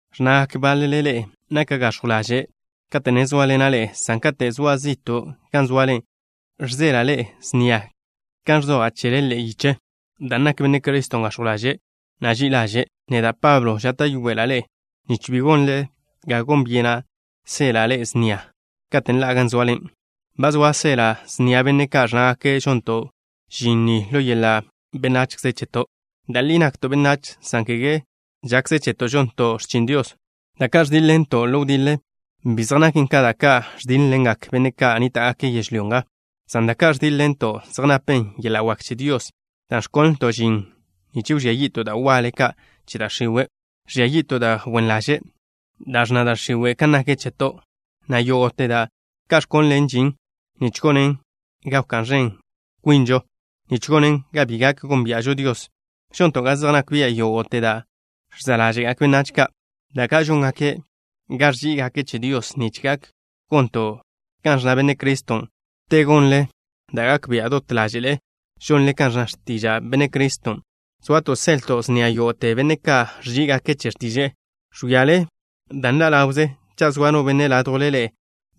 Ẕnnagak báḻele ḻe'e naka' gax̱jw ḻaže' kate' ne zóaḻena' ḻe'e, san kate' zoa' zi'to' gan zoale žseḻa' ḻe'e snia kan ẕzoja' chele ḻe'e yiche. Dan' nak Benne' Criston' gax̱jw ḻaže', na' ži'i ḻaže', neda', Pablo, žáta'yoela' ḻe'e nich bi gonle ga gon byenen seḻa' ḻe'e snia katen' ḻa'a gan zoale. Ba zoa' seḻa' snia benne' ka' ẕnnágake' žonto' žin ni ḻo yeḻa' benachze cheto'. Da' li nakto' benách, san kege žakze cheto' žonto' x̱chin Dios. Da' ka' ẕdíḻ-ḻento' ḻo wdiḻe, bi zej naken ka da' ka' ẕdíḻ-ḻengak benne' ka' nníta'gake' yežlyó nga, san da' ka' ẕdíḻ-ḻenton' zej napen yeḻa' wak che Dios, dan' ẕkonlto' žin nich wžía yi'to' da' waḻe ka' che da' x̱iwe'. Ẕžia yi'to' da' wen ḻaže' ka' da' ẕnna da' x̱iwe' kan nak cheto', na' yógo'te da' ka' ẕkonlen žin nich gonen ga wká'n ẕen kwinžo, nich gonen ga bi gak gónbia'žo Dios. Žonto' ga zej nak bia' yógo'te da' ẕza' ḻáže'gak benách ka', da ka' žóngaken ga ẕží'igake' che Dios, nich gak gonto' kan ẕnna Benne' Criston'. Te gonle da' gak bia' dot ḻáže'le žonle kan ẕnna x̱tiža' Benne' Criston', soato' seḻto' snia yógo'te benne' ka' ẕží'igake' che x̱tiže'e. Ẕwíale da' nḻa' ḻawze. Cha' zoa no benne' ládjwle ḻe'e,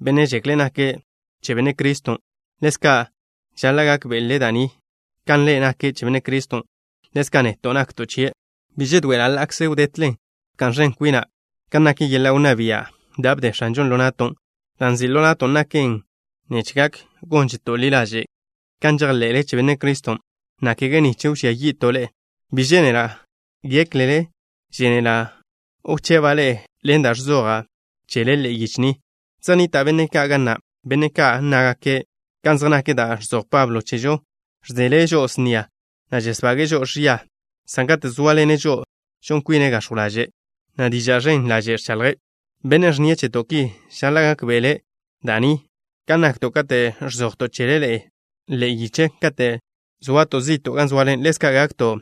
benne' žekle' nake' che Benne' Criston', ḻezka' žaḻa' gákbe'le' da' ni: kan ḻe' nake' che Benne' Criston', ḻezka' neto' nakto' chie'. Bi žedoe'ela' ḻa'kze wdetlen bka'n ẕen kwina' kan nak yeḻa' wnná bia' da' bde X̱anžon' ḻo na'to'. Da' nzi' ḻo na'to' naken nich gak gónžeto' ḻi ḻaže' kan žejḻe'le che Benne' Criston', na' kege nich wžía yi'to' ḻe'e. Bi žénela' géklele žénela' wcheba' ḻe'e ḻen da' ẕzoja' chele ḻe'e yiche ni. Zej nnita' benne' ka' ga na', benne' ka' nnágake': “Kan zej nak da' ka' ẕzoj Pablo chežo, žseḻe' žo'o snia, na' žesbage'e žo'o ẕia, san kate' zóaḻene' žo'o žon kwine' gax̱jw ḻaže', na' diža' ẕen ḻaže' ẕchaḻje'.” Bennen' ẕnnie' cheto' ki žaḻa' gákbe'ele' da' ni: kan nakto' kate' ẕzojto' chele ḻe'e yiche kate' zoato' zi'to' gan zoale, ḻezka' gakto'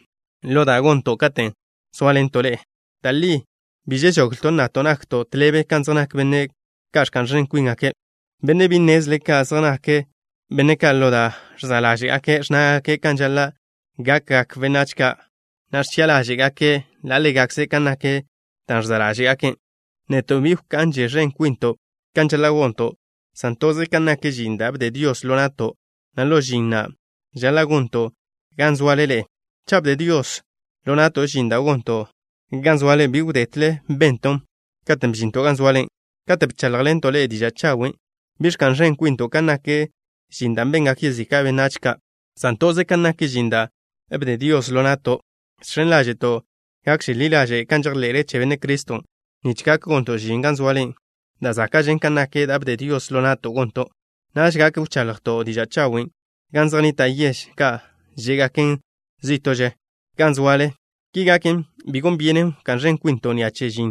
ḻo da' gonto' katen' sóaḻento' ḻe'e. Da' li bi žežoglto' nnato' nakto' tḻebe kan zej nak benne' ka' ẕka'n ẕen kwíngake'. Benne' bi nnezle ka' zej nak benne' ka'. Ḻo da' ẕza' ḻáže'gake' ẕnnágake' kan žaḻa' gakgak benách ka', na' ẕchi'a ḻáže'gake' ḻa' ḻégakze' kan nak dan' ẕza' ḻáže'gake'. Neto' bi wka'nže ẕen kwinto' kan žaḻa' gonto', san toze kan nak žin da' bde Dios ḻo na'to', na' ḻo žin na', žaḻa' gonton' gan zoale ḻe'e. Cha' bde Dios ḻo na'to' žin da' gonto' gan zoale, bi wdetle benton' katen' bžinto' gan zoale, katen' bcháḻjḻento' ḻe'e diža' chawen'. Bi ẕka'n ẕen kwinto' kan nak žin da' bengak yezika' benách ka', san toze kan nak žin da' bde Dios ḻo na'to'. Žx̱en ḻáže'to' gakže ḻi ḻaže' kan žejḻe'le che Benne' Criston' nich gak gonto' žin gan zoale da' záka'žen, kan nak da' bde Dios ḻo na'to' gonton'. Naž gak wchaḻjto' diža' chawen' gan zej nnita' yež ka' žé'gaken zí'to'že gan zoale. Ki gaken, bi gon byenen wká'n ẕen kwinto' ni'a che žin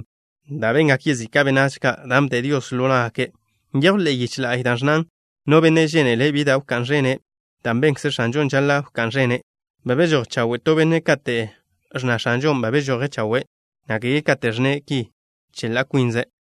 da' bengak yezika' benách ka', dan' bde Dios ḻo ná'gake'. Nyejw ḻe'e yiche la'y da' ẕnnan: No benne' žénele' bi da' wká'n ẕene', da' benkze X̱anžon' žaḻa' wká'n ẕenen'. Ba bežój chawe' to benne' kate' ẕnna X̱anžon' ba bežoje' chawe', na' kege kate' ẕnne' ki che ḻa' kwinze'.